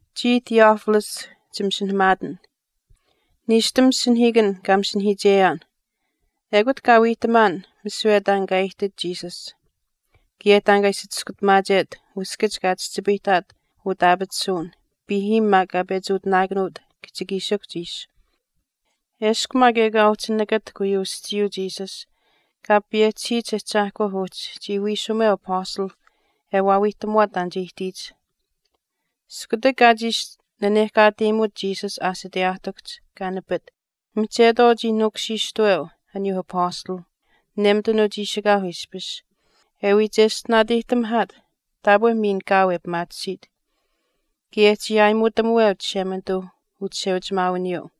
Chiya Theophilus chimasinahamaatin. Niishtam masinahiikan kaa masinahamaacheyaan ekut kaa wiihtamaan misiwe taan kaa aihtit Jesus kaye taan kaa ishi chiskutamaachet uskach kaa chihchipayihtaat utaapatisuwin piihiim maak kaa pechi utinaakanuut kihchikiishikuhch ishi. Eshkw maak ekaa uhchi nakatahk uyuu aschiiyuu Jesus Kaa payehchisiyich Ahchaahkwa uhchi chii wiishumeu Apastalh e wiihtamuwaat taan che ihtiyich. Iskutak kaa chiishi nanehkaateyimut Jesus aashiteyaahtikuhch kaa nipit mihchetwaau chii nuukushiishtaweu aniyuu Apastalh nemitanuu chiishikaauh ishpish, e wii cheshtinaateyihtamihaat taapwe miin kaau e pimaatisiit, kaye chii aayimuutamuweu Chishemanituu uchisheuchimaawiniyuu.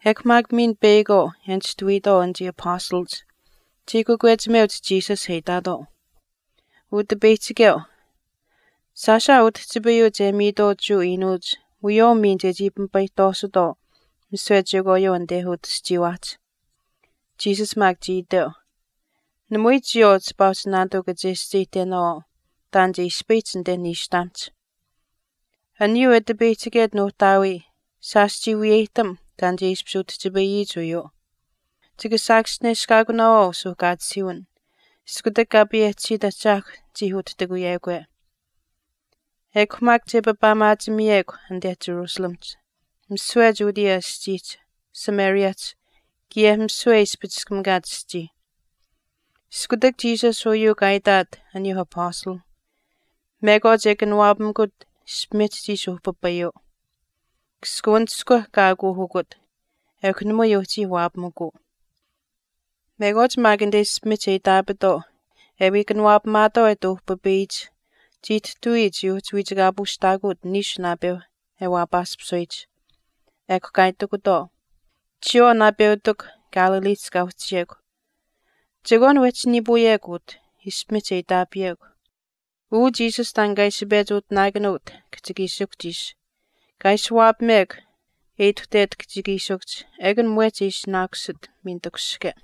Ekw maak miin peyakwaau e nishtuwiitwaau anichii apastalach chii kakwechimeuch Jesus e itaatwaau, “Utipeyihchikeu, shaash aa utihchipayuu che miitwaau Jewa iinuuch wiyawaau miin chechii pimipayihtwaasutwaau misiwe chekwaayuu anite utaschiiwaahch.” Jesus maak chii iteu, “Namui chiyawaau chipaa uhchi naanituu kachescheyihtenaawaau taan che ispayihch anite niishtamihch. Aniyuu e tipeyihchiket Nuuhtaawii shaash chii wiyeyihtam taan che ishpish utihchipayiyich uyuu. Chika saakaschineshkaakunaawaau suuhkaatisiiwin, iskutak Kaa payehchisiit Ahchaahkw chii utihtikuyekwe. Ekw maak che papaamaachimiyekw anite Jerusalemihch, misiwe Judea aschiihch, Samariahch kaye misiwe e ispichiskamikaach aschii.” Iskutak Jesus uyuu kaa itaat aniyuu apastalh mekwaach e kanawaapamikut ishpimihch chii ishi uhpipayuu. Kaskawanishkwa kaa aakuuhukut ekw namui uhchii waapamikuu. Mekwaach maak anite ishpimihch e iitaapitwaau e wii kanawaapamaatwaau e ati uhpipayiyich chiihtihtawii chii uhchi wiichikaapuushtaakuuch niishu naapeu e waapaaspisuyich. Ekw kaa itikutwaau, “Chiyawaau naapeutikw Galileehch kaa uhchiyekw, chekwaan wehchi niipuuyekw utah, ishpimihch e iitaapiyekw. Uu Jesus taan kaa ishi pechi utinaakanuut kihchikiishikuhch ishi, kaa ishi waapamekw e ituhtet kihchikiishikuhch ekun mwehch che ishinaakusit miin takushihke.”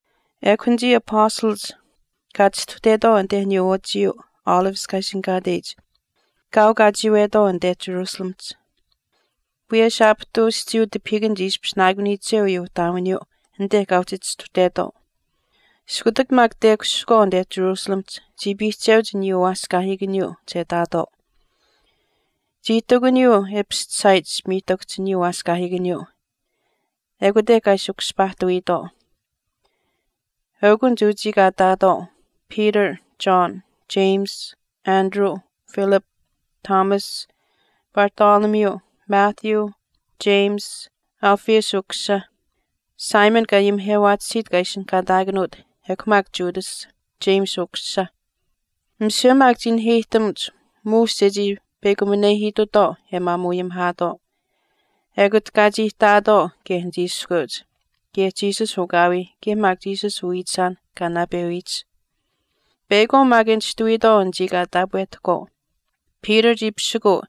Ekw anichii apastalach kaa chistuhtetwaau anite aniyuu wachiyuu Olives kaa ishinihkaateyich kaau kaa chiiwetwaau anite Jerusalemihch. Wiyesh aapihtuu aschiiyuu tipahiikan chii ishpishinaakuniyiche uyuu ihtaawiniyuu anit kaa uhchi chistuhtetwaau. Iskutak maak tekushihkwaau anite Jerusalemihch chii piihcheuch aniyuu waaskaahiikaniyuu che ihtaatwaau. Chii ihtakuniyuu e pischisaayich ishpimiihtakuhch aniyuu waaskaahiikaniyuu. Ekute kaa ishi kushpaahtawiitwaau. Eukunich uchii kaa ihtaatwaau, Peter, John, James, Andrew, Philip, Thomas, Bartholomew, Matthew, James Alphaeus ukusisa, Simon kaa ayimihewaatisiit kaa ishinihkaataakanuut, ekw maak Judas, James ukusisa. Misiwe maak chii naheyihtamuch muush chechii peyakuminehiitutwaau e maamuu ayimihaatwaau. Ekut kaa chii ihtaatwaau kaye anichii iskweuch kaye Jesus ukaawii kaye maak Jesus uwiichisaan kaa naapewiyich. Peyakwaau maak e nishtuwiitwaau anichii kaa taapwehtahkwaau, Peter chii pisikuu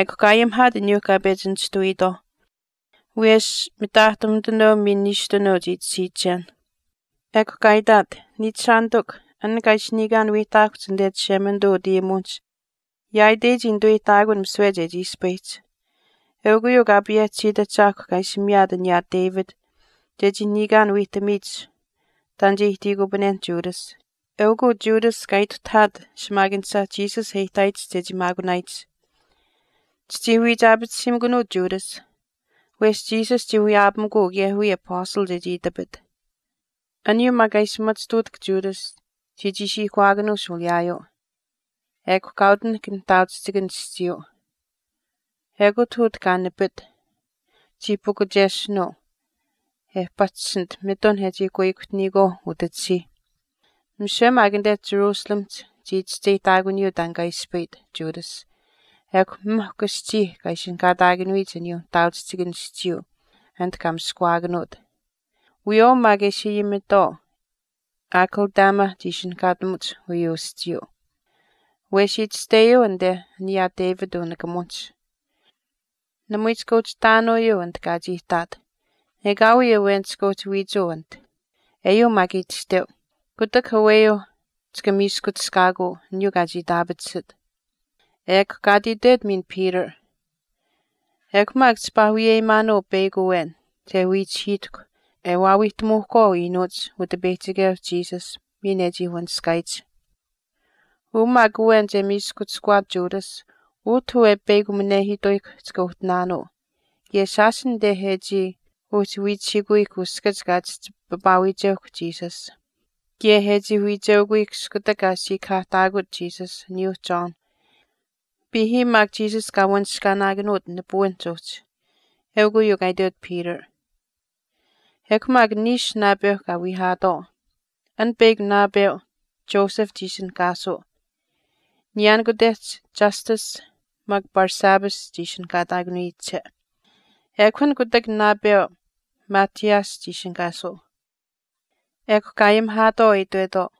ekw kaa ayimihaat aniyuu kaa pechi nishtuwiitwaauh. Wiyesh mitaahtumitanuu miin niishtunuu chii tashiichen. Ekw kaa itaat, “Niichishaanitikw, an kaa ishi niikaan wiihtaakuhch anite Chishemanituu utayimuwinihch yaaitei chii nituweyihtaakun misiwe chechii ispayihch. Eukw uyuu Kaa payehchisiit Ahchaahkw kaa ishi miyaat aniyaa David chechii niikaan wiihtamiyich taan che ihtiikupanenh Judas. Eukw uu Judas kaa ituhtahaat shimaakanisha Jesus e ihtaayich chechii maakunaayich. Chichii wiichaapatisiimikunuu Judas, wesh Jesus chii wiyaapamikuu kaye wiya apastal chechii itapit.” Aniyuu maak kaa ishi machituutahk Judas chii chiishiihkawaakanuu shuuliyaayuu. Ekw kaa utinahk nihtaauchihchikan aschiiyuu. Ekut utah kaa nipit, chii pukuchesinuu e pahchishinit mitun e chii kuihkuhtiniyikwaau utachisiih. Misiwe maak anite Jerusalemihch chii chischeyihtaakunuuyuu taan kaa ispayit Judas ekw mihkw aschii kaa ati ishinihkaataakanuyich aniyuu nihtaauchihchikan aschiiyuu anite kaa miskawaakanuut. Wiyawaau maak e ishi ayimitwaau Akeldama chii ishinihkaatamuch uyuu aschiiyuu. Wesh itashteyuu anite aniyaa David unikamuwinihch, Namui chika uhchi ihtaanuuyuu anit kaa chii ihtaat, ekaawii awen chika uhchi wiichuu anit. Eyuu maak itashteu, Kutak aweyuu chika miiskuchishkaakuu aniyuu kaa chii itaapatisit. Kaa ati itwet miin Peter, “Ekw maak chipaa wiyeyimaanuu peyakw awen che wiichihiitahkw e waawiihtamuuhkwaau iinuuch Utipeyihchikeu Jesus miin e chii wanishkaayich. Uu maak awen che miiskuchishkuwaat Judas utah uu e peyakuminehiituyihkw chika uhtinaanuu kaye shaash anite e chii uhchi wiicheukuyihkw uskach kaa chihchi papaawiicheukw Jesus. Kaye e chii wiicheukuyihkw iskutak kaa siikahaahtaakut Jesus aniyuu John, piihiim maak Jesus kaa wanishkaanaakauut Jesus nipuwinihch uhchi.” Eukw uyuu kaa itwet Peter. Ekw maak niishu naapeu kaa wiihaatwaau. An peyakw naapeu Joseph chii ishinihkaasuu. Niyaanikutehch Justus maak Barsabbas chii ishinihkaataakanuyiche. Ekw an kutak naapeu Matthias chii ishinihkaasuu. Ekw kaa ayimihaatwaau e itwetwaau,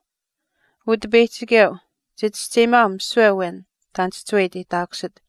“Utipeyihchikeu, chichischeyimaau misiwe awen taan chihchiwe e iteyihtaakusit.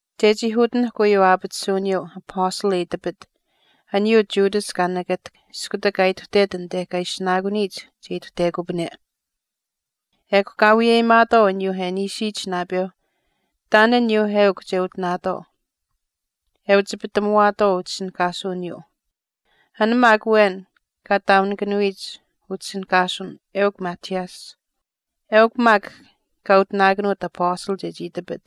chechii utinahk uyuu aapatisuwiniyuu apastal e itapit, aniyuu Judas kaa nakatahk iskutak kaa ituhtet anite kaa ishinaakuniyich che ituhtekupane.” Ekw kaa wiyeyimaatwaau aniyuu e niishiyich naapeu taan aniyuuh eukw che utinaatwaau, e uchipitamuwaatwaau utishinihkaasuwiniyuu. An maak awen kaa taaunikanuyich utishinihkaasuwin eukw Matthias. Eukw maak an kaa utinaakanuut Apastal chechii itapit.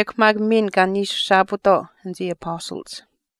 Ekw maak miin kaa niishuushaapuutwaau anichii Apastalach.